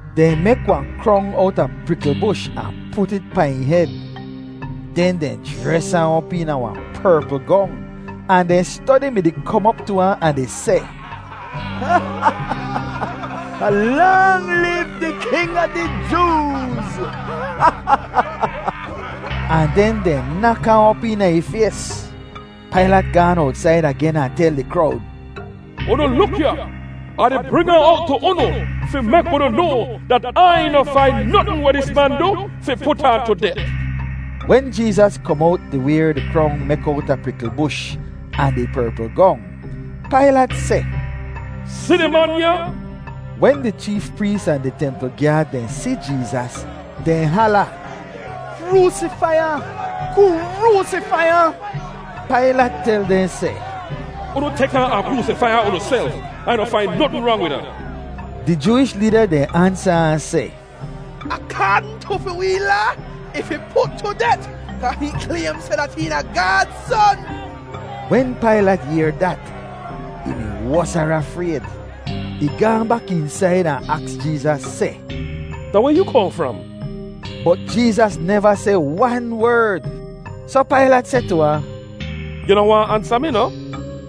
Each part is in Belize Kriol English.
Dehn mek wahn krong owta prikl bush ahn put it pahn ih hed. Den dehn jres ahn op eena wahn perpl gong ahn dehn stodi mi-di kom op tu ahn di seh, “Lang liv di king a di Jooz!” Ahn den dehn nak ahn op eena ih fays. Pailat gaan owtsaid agen ahn tel di krowd, “Unu luk ya, Ah di bring ahn owt tu unu fi mek unu noa dat Ai noh fain notn weh dis man du fi put ahn tu det.” Wen Jeezas kom owt di wayr di krong mek owta prikl bush ahn di perpl gong, Pailat seh, “Si di man ya!” Wen di cheef prees ahn di templ gyaad dehn si Jeezas, dehn hala, “Kroosifai ahn! Kroosifai ahn!” Pailat tel dehn seh, “Unu tek ahn, ahn kroosifai ahn unuself; Ai noh fain notn rang wid ahn.” Di Jooish leeda dehn ansa ahn seh, “Akaadn tu fi wee Laa, ih fi put tu det kaa hihn klaym seh dat hihn da Gaad Son.” Wen Pailat yehr dat, ih mi wosara frayd. Ih gaahn bak eensaid ahn aks Jeezas seh, “Da weh yoo kohn fram?” Bot Jeezas neva seh wan werd. Soh Pailat seh tu ahn, “Yu noh waahn ansa mi noh?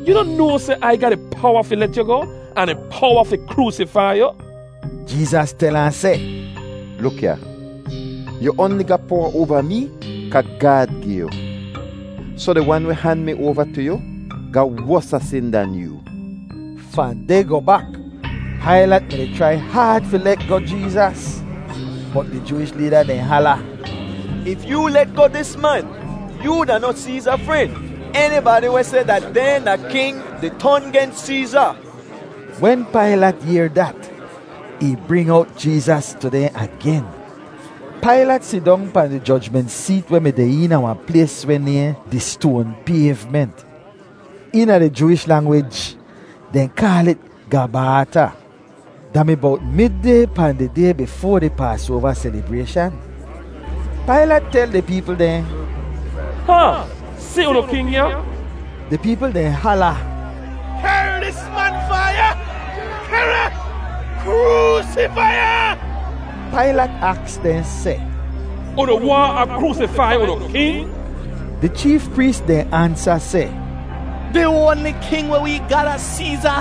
Yu noh noa seh Ai ga di powa fi let yu goh, ahn di powa fi kroosifai yu?” Jeezas tel ahn seh, “Luk ya, yu oanli ga powa oava mee kaa Gaad gi yu. Soh di wan weh han mi oava tu yu ga wosa sin dan yoo.” Fahn deh goh bak, Pailat mi-di chrai haad fi let goh Jeezas, bot di Jooish leeda dehn hala, “If yoo let goh dis man, yoo da noh Seeza fren. Enibadi weh seh dat dehn da king di ton gens Seeza.” Wen Pailat yehr dat, ih bring owt Jeezas tu dehn agen. Pailat sidong pahn di jojment seet weh mi deh eena wahn plays weh nayhn “di Stoan Payvment.” Eena di Jooish langwij dehn kaal it “Gabaata.” Da mi bowt mid-day pahn di day bifoa di Paasoava selibrayshan. Pailat tel di peepl dehn, “Hahn, si unu king ya!” Di peepl dehn hala, “Kehr dis man fahn ya! Kehr ahn! Kroosifai ahn!” Pailat aks dehn seh, “Unu waahn Ah kroosifai unu king?” Di cheef prees dehn ansa seh, “Di oanli king weh wee ga da Seeza.”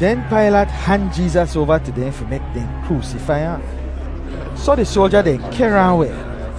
Den Pailat han Jeezas oava tu dehn fi mek dehn kroosifai ahn. Soh di soalja dehn kehr ahn weh.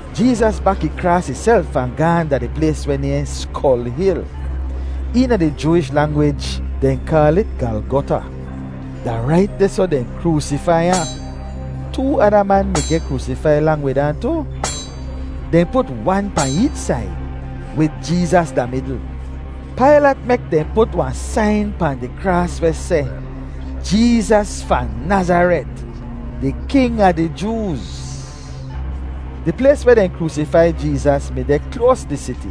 Jeezas bak ih kraas ihself ahn gaahn da di plays weh nayhn “Skol Hil.” Eena di Jooish langwij, dehn kaal it “Galgota.” Da rait dehsoh dehn kroosifai ahn. Too ada man mi geh kroosifai lang wid ahn tu. Dehn put wan pahn eech said, wid Jeezas da midl. Pailat mek dehn put wahn sain pahn di kraas weh seh: JEEZAS FAHN NAZARET, DI KING A DI JOOZ. Di plays weh dehn kroosifai Jeezas mi deh kloas di siti,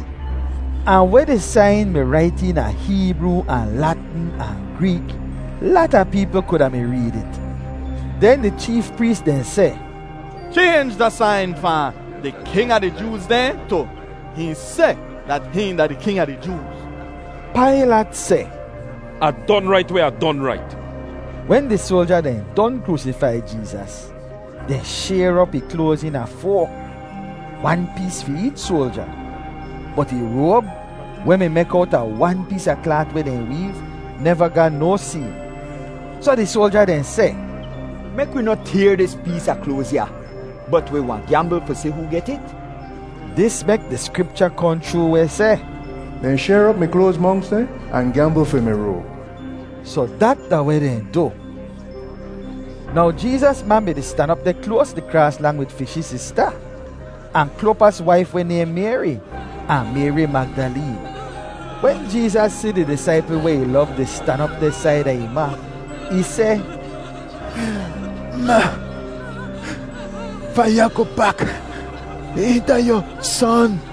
ahn weh di sain mi rait eena Heebroo ahn Latn ahn Greek, lata peepl kuda mi reed it. Den di cheef prees dehn seh, “Chaynj da sain fahn ‘Di king a di Jooz dehn’ tu ‘Hihn seh dat hihn da di king a di Jooz.’” Pailat seh, “Ah don rait weh Ah don rait!” Wen di soalja dehn don kroosifai Jeezas, dehn shayr op ih kloaz eena foa, wan pees fi eech soalja. Bot ih roab, weh mi mek owta wan pees a klaat weh dehn weev, neva ga no seem. Soh di soalja dehn seh, “Mek wi noh tayr dis pees a kloaz ya, bot wi wahn gyambl fi si hoo get it.” Dis mek di Skripcha kohn chroo weh seh, “Dehn shayr op mi kloaz monks dehn ahn gyambl fi mi roab.” Soh dat da weh dehn du. Now Jeezas ma mi-di stan op deh kloas di kraas lang wid fi shee sista, ahn Klopas waif weh nayhn Mayri, ahn Mayri Magdaleen. Wen Jeezas si di disaipl weh ih lov di stan op deh saida ih ma, ih seh, “Ma, fahn ya goh bak hihn da yu son.”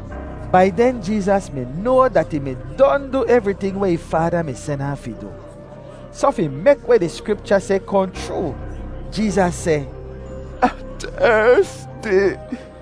Bai den Jeezas mi noa dat ih mi don du evriting weh ih Faada mi sen ahn fi du. Soh, fi mek weh di Skripcha seh kohn chroo, Jeezas seh, “Ah tersti.”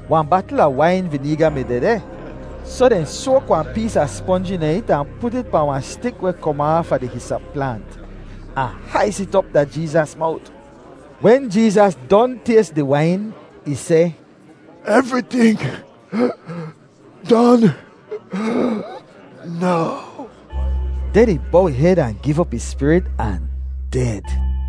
Wahn batl a wain vineega mi dehdeh, soh dehn soak wahn pees a sponj eena it ahn put it pahn wahn stik weh kom aafa di hisop plaant, ahn hais it op da Jeezas mowt. Wen Jeezas don tays di wain, ih seh, “Evriting don now.” Den ih bow ih hed ahn giv op ih spirit ahn ded.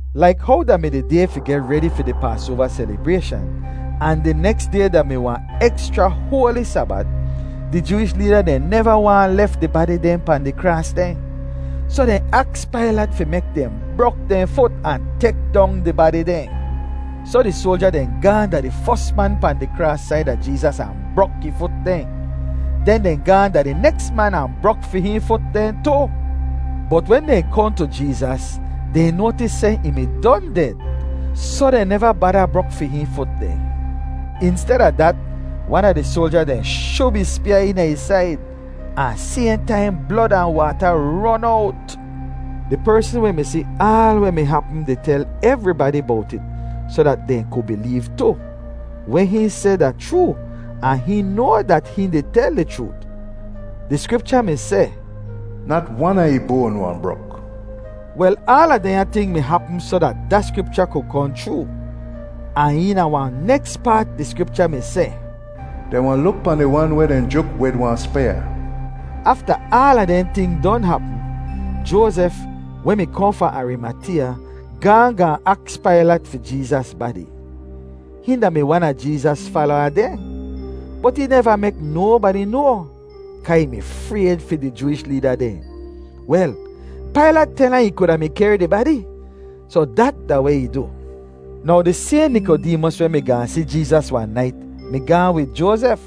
Laik how da mi di day fi geh redi fi di Paasoava selibrayshan, ahn di neks day da-mi wahn ekschra hoali Sabat, di Jooish leeda dehn neva waahn lef di badi dehn pahn di kraas dehn. Soh dehn aks Pailat fi mek dehn brok dehn fut ahn tek dong di badi dehn. Soh di soalja dehn gaahn da di fos man pahn di kraas saida Jeezas ahn brok ih fut dehn. Den dehn gaahn da di neks man ahn brok fi hihn fut dehn tu. Bot wen dehn kohn tu Jeezas, dehn noatis seh ih mi don ded, soh dehn neva bada brok fi hihn fut dehn. Insteda dat, wan a di soalja dehn shub ih spyaa eena ih said, ahn sayhn taim blod ahn waata ron owt. (Di persn weh mi si aal weh mi hapm di tel evribadi bowt it soh dat dehn ku bileev tu. Weh hihn seh da chroo ahn hihn noa dat hihn di tel di chroot.) Di Skripcha mi seh, “Nat wan a ih boan wahn brok.” Wel, aala dehnya ting mi hapm soh dat da Skripcha ku kohn chroo. Ahn eena wahn neks paat di Skripcha mi seh, “Dehn wahn luk pahn di wan weh dehn juk wid wahn spyaa.” Afta aala dehn ting don hapm, Joazef, weh mi kohn fahn Arimateeya, gaahn gaahn aks Pailat fi Jeezas badi. Hihn da-mi wan a Jeezas falowa dehn, bot ih neva mek nobadi noa kaa ih mi frayd fi di Jooish leeda dehn. Wel, Pailat tel ahn ih kuda mi kehr di badi, soh dat da weh ih du. Now di sayhn Nikodeemos, weh mi gaahn si Jeezas wahn nait, mi gaahn wid Joazef,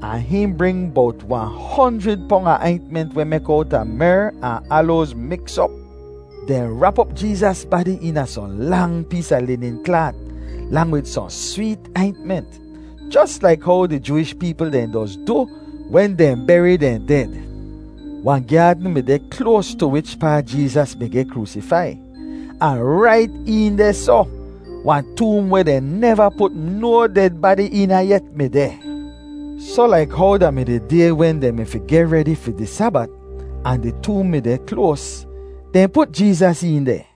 ahn hihn bring bowt wahn honjrid pong a aintment weh mek owta mer ahn aloaz miks op. Dehn rap op Jeezas badi eena sohn lang pees a linin klaat lang wid sohn sweet aintment, jos laik how di Jooish peepl dehn doz du wen dehn beri dehn ded. Wahn gyaadn mi deh kloas tu wichpaa Jeezas mi geh kroosifai, ahn rait een dehsoh, wahn toom weh dehn neva put no ded badi eena yet mi deh. Soh laik how da mi di day wen dehn mi fi geh redi fi di Sabat ahn di toom mi deh kloas, dehn put Jeezas een deh.